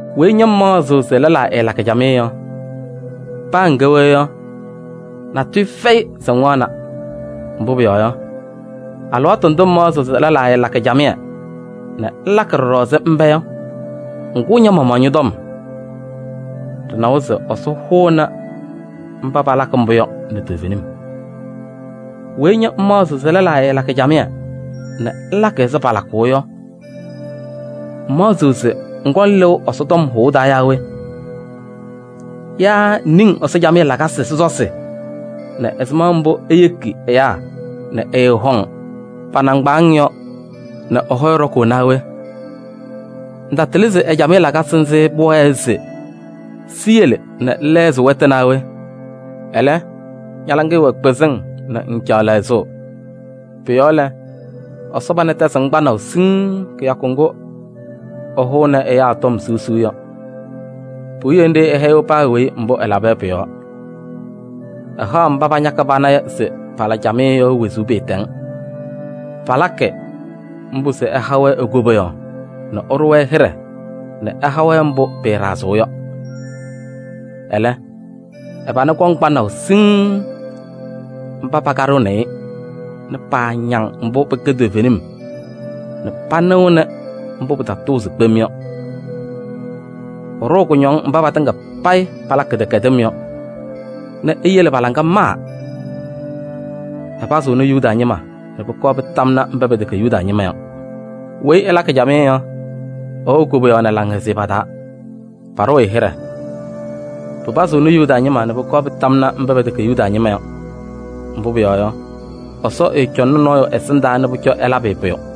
Weyi ña ŋmaɣzɩɣ se lɛlaa ɛɛlakɩ camɩyɛ yɔ, paa ŋkɛ we yɔ, natʋyʋ fɛyɩ se ŋwaɣna. Mbʋ pʋyɔɔ yɔ, alɩwaatʋ ndʋ ŋmaɣzɩɣ se lɛlaa ɛɛlakɩ camɩyɛ nɛ ŋlakɩ ɖɔɖɔ ɛzɩ mba yɔ, ŋkʋʋ ña-maɣmaɣ ñɔ-tɔm. Ɖɩnawa se Ɛsɔ hʋʋnɩ mba palakɩ mbʋ yɔ nɛ toovenim. Weyi ña ŋmaɣzɩɣ se lɛlaa ɛɛlakɩ camɩyɛ nɛ ŋlakɩ ɛzɩ palakʋʋ yɔ, ŋmaɣzɩɣ se ŋkɔŋ lɩʋ Ɛsɔ tɔm hʋʋ taa yaa we? Yaa ŋniŋ Ɛsɔ camɩyɛ lakasɩ sɔsɔsɩ nɛ ɛzɩma mbʋ eyeki ɛyaa nɛ ɛɛhɔŋ pa-nɩŋgbaaŋ yɔ nɛ ɛ-hɔyɛ ɖɔkʋʋ naa we? Ŋtatɩlɩ se ɛ-camɩyɛ lakasɩ nzɩ pʋwɛɛ se siyele nɛ ŋlɛɣzɩ wɛtʋ naa we? Ɛlɛ, ña-laŋɩyɛ wɛ kpɩzɩŋ nɛ ŋŋcaɣ lɛɣzʋʋ. Pʋ-yɔɔ lɛ, Ɛsɔ pana tɛzɩɣ-ŋ kpanaʋ siŋŋ kɩyakʋ ŋgʋ ɛhʋʋnɩ ɛyaa tɔm siɣsiɣ yɔ. Puwiye ɛhɛyɩɣ paa weyi mbʋ ɛlaba yɔ pʋ-yɔɔ: ɛhaɣ mba pañakɩ pana se pala camɩyɛ yɔ wezuu pɩɩtɛŋ. Palakɩ mbʋ se ɛha-wɛ e-koboyaɣ nɛ ɛɖʋ-wɛ hɩɖɛ nɛ ɛha-wɛ mbʋ pɩɩɖazɩɣ yɔ. Ɛlɛ, ɛ-pana kɔŋ kpanaʋ siŋŋ mba pakaɖɩɣnɩ-ɩ nɛ paañaŋ mbʋ pɩkɛ toovenim nɛ panɩɣnɩ mbʋ pɩtatʋʋzɩ kpem yɔ. Ɛɖʋʋ kʋñɔŋ mba patɩŋa payɩ palakɩ kɩdɛkɛdɩm yɔ nɛ eyele pa-laŋa maa. Ɛpazɩɣnɩ Yuda ñɩma nɛ pʋkɔɔ pɩtamnɩ mba pɛtɛkɛ Yuda ñɩma yɔ! Weyi ɛlakɩ camɩyɛ yɔ, ɛwɛɣ koboyaɣ nɛ laŋhɛzɩyɛ pa-taa, paɖʋʋ-ɩ hɩɖɛ. Pɩpazɩɣnɩ Yuda ñɩma nɛ pʋkɔɔ pɩtamnɩ mba pɛtɛkɛ Yuda ñɩma yɔ! Mbʋ pʋyɔɔ yɔ, Ɛsɔ ɛɛcɔŋnɩ nɔɔyʋ ɛsɩndaa se pʋcɔ ɛlabɩ-ɩ pʋyʋ.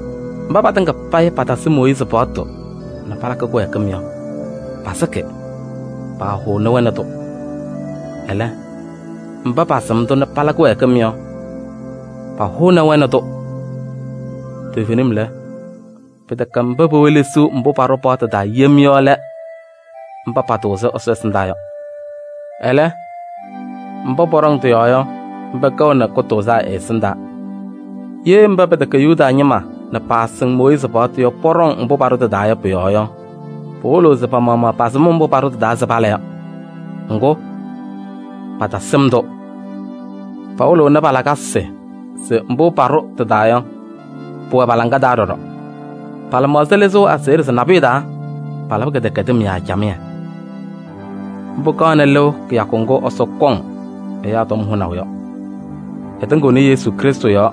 Mba patɩŋa payɩ patasɩ Mooyiizi paɣtʋ nɛ palakɩ kɩwɛɛkɩm yɔ, pasɩkɩ, paahʋʋnɩ-wɛ nɛ tʋ. Ɛlɛ, mba pasɩm-tʋ nɛ pala kɩwɛɛkɩm yɔ, pahʋʋnɩ-wɛ nɛ tʋ. Toovenim lɛ, pɩtɛkɛ mba pewelesiɣ mbʋ paɖʋ paɣtʋ taa yem yɔ lɛ mba patʋʋzɩ Ɛsɔ ɛsɩndaa yɔ. Ɛlɛ, mba pɔɖɔŋ tɩ-yɔɔ yɔ, mba kɛɣnɩ kʋtʋʋzaa ɛ-ɛsɩndaa. Ye mba pɛtɛkɛ Yuda ñɩma nɛ paasɩŋ Mooyiizi paɣtʋ yɔ, pɔɖɔŋ mbʋ paɖʋ tɩ-taa yɔ pʋ-yɔɔ yɔ, pɩwɩlɩɣ se pa-maɣmaɣ pasɩm mbʋ paɖʋ tɩ-taa se pala yɔ. Ŋgʋ, patasɩm-tʋ. Pawɩlɩɣnɩ pa-lakasɩ se mbʋ paɖʋ paɣtʋ taa yɔ, pʋwɛ pa-laŋa taa ɖɔɖɔ. Pa-lɩmaɣza lɩzɩɣ aseɣɖe se nabʋyʋ taa, palabɩ kɩdɛkɛdɩm yaa camɩyɛ. Mbʋ kaɣnɩ lɩʋ kɩyakʋ ŋgʋ Ɛsɔ kɔŋ ɛyaa tɔm hʋnaʋ yɔ. Ɛtɩŋɩɣnɩ Krɩstʋ Yesu yɔɔ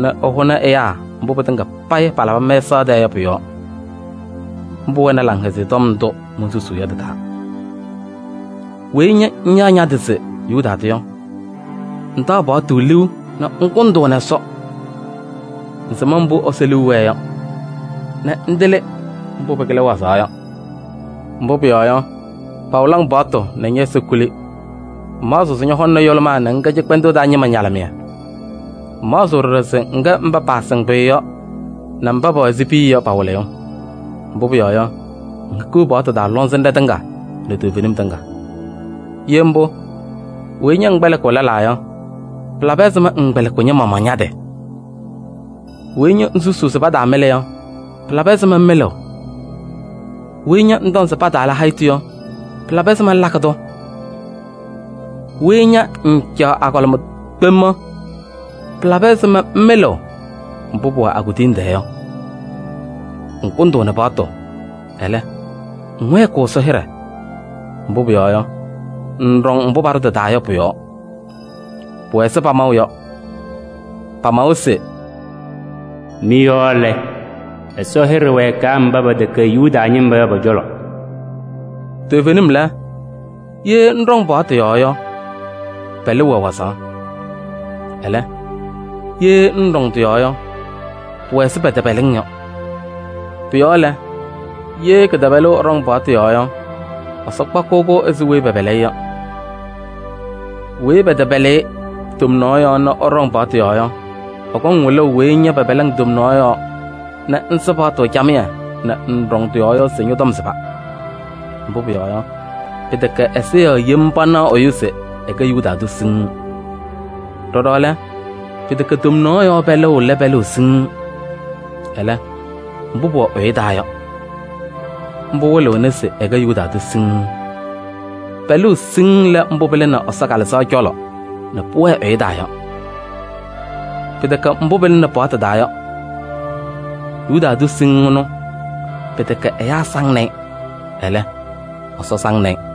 nɛ ɛhʋnɩ ɛyaa mbʋ pɩtɩŋa payɩ palabɩ mɛsaɣ tɛɛ yɔ pʋ-yɔɔ. Mbʋ wɛnɩ Laŋhɛzɩyɛ Tɔm ndʋ monsusuu yɔ tɩ-taa. Weyi ña ŋyaɣ ña-tɩ se Yuda tʋ yɔ, ŋtaɣ paɣtʋ liu nɛ ŋkʋndʋʋnɩ Ɛsɔ. Ŋsɩm mbʋ Ɛsɔ liu wɛɛ yɔ, nɛ ŋtɩlɩ mbʋ pɩkɩlɩ wazaɣ yɔ. Mbʋ pʋyɔɔ yɔ, pawɩlɩ-ŋ paɣtʋ nɛ ñɛ-ɛza kuli. Ŋmaɣzɩɣ se ñɔhɔŋnɩ yʋlʋmaa nɛ ŋkɛ cɩkpɛndʋʋ taa ñɩma ñalɩmɩyɛ. Ŋmaɣzɩɣ ɖɔɖɔ se ŋkɛ mba paasɩŋ pʋyʋ yɔ nɛ mba pɛwɛ ɛzɩ piya yɔ pa-wɩlɩyʋ. Mbʋ pʋyɔɔ yɔ, ŋhikiɣ paɣtʋ taa lɔŋsɩnɖɛ tɩŋa nɛ toovenim tɩŋa. Ye mbʋ, weyi ña ŋkpɛlɩkɩɣ lɛlaa yɔ, pɩlabɩ ɛzɩma ŋŋkpɛlɩkɩɣ ña-maɣmaɣ ña-tɩ? Weyi ña ŋsusuu se pataamɩlɩ yɔ, pɩlabɩ ɛzɩma ŋmɩlɩɣ? Weyi ña ŋtɔŋ se pataala hayitu yɔ, pɩlabɩ ɛzɩma ŋlakɩ-tʋ? Weyi ña ŋŋcaɣ agɔlɩma kpem yɔ, pɩlabɩ ɛzɩma ŋmɩlɩɣ mbʋ pʋwɛ a-kuduyiŋ tɛɛ yɔ? Ŋkʋndʋʋnɩ paɣtʋ, ɛlɛ, ŋwɛɛkɩɣ Ɛsɔ hɩɖɛ. Mbʋ pʋyɔɔ yɔ, ŋŋɖɔŋ mbʋ paɖʋ tɩ-taa yɔ pʋ-yɔɔ. Pʋwɛ ɛzɩ pamaʋ yɔ, pamawa se: “Mɩ-yɔɔ lɛ, Ɛsɔ hɩɖɛ wɛɛkɩ mba pɛtɛkɛ Yuda ñɩma yɔ pɔ-cɔlɔ.” Toovenim lɛ, ye ŋɖɔŋ paɣtʋ yɔɔ yɔ, pɛlʋʋ wɛ wazaɣ. Ɛlɛ, ye ŋŋɖɔŋ tɩ-yɔɔ yɔ, pʋwɛ ɛzɩ pɛtɛpɛlɩ-ŋ yɔ. Pʋ-yɔɔ lɛ, ye kɩtɛpɛlʋʋ ɛɖɔŋ paɣtʋ yɔɔ yɔ, Ɛsɔ kpakɩɣ-kʋ ɛzɩ weyi pɛpɛlɩ-ɩ yɔ. Weyi pɛtɛpɛlɩ-ɩ tomnaɣ yɔɔ nɛ ɛɖɔŋ paɣtʋ yɔɔ yɔ, ɛkɔŋ wɩlʋʋ weyi ña pɛpɛlɩ-ŋ tomnaɣ yɔɔ nɛ ŋsɩ paɣtʋ camɩyɛ nɛ ŋŋɖɔŋ tɩ-yɔɔ yɔ se ñɔ-tɔm sɩba. Mbʋ pʋyɔɔ yɔ, pɩtɛkɛ ɛza yɔɔ yem panaɣ ɛyʋ se ɛkɛ Yuda tʋ siŋŋ. Ɖɔɖɔ lɛ, pɩtɛkɛ tomnaɣ yɔɔ pɛlʋʋ lɛ pɛlʋʋ siŋŋ. Ɛlɛ, mbʋ pʋwɛ ɛyʋ taa yɔ, mbʋ wɩlɩɣna se ɛkɛ Yuda tʋ siŋŋ. Pɛlʋʋ siŋŋ lɛ mbʋ pɩlɩnɩ Ɛsɔ Kalɩzaɣ cɔlɔ nɛ pʋwɛɛ ɛyʋ taa yɔ. Pɩtɛkɛ mbʋ pɩlɩnɩ paɣtʋ taa yɔ. Yuda tʋ siŋŋ ɛnʋ, pɩtɛkɛ ɛyaa saŋnɩ-ɩ, ɛlɛ, Ɛsɔ saŋnɩ-ɩ.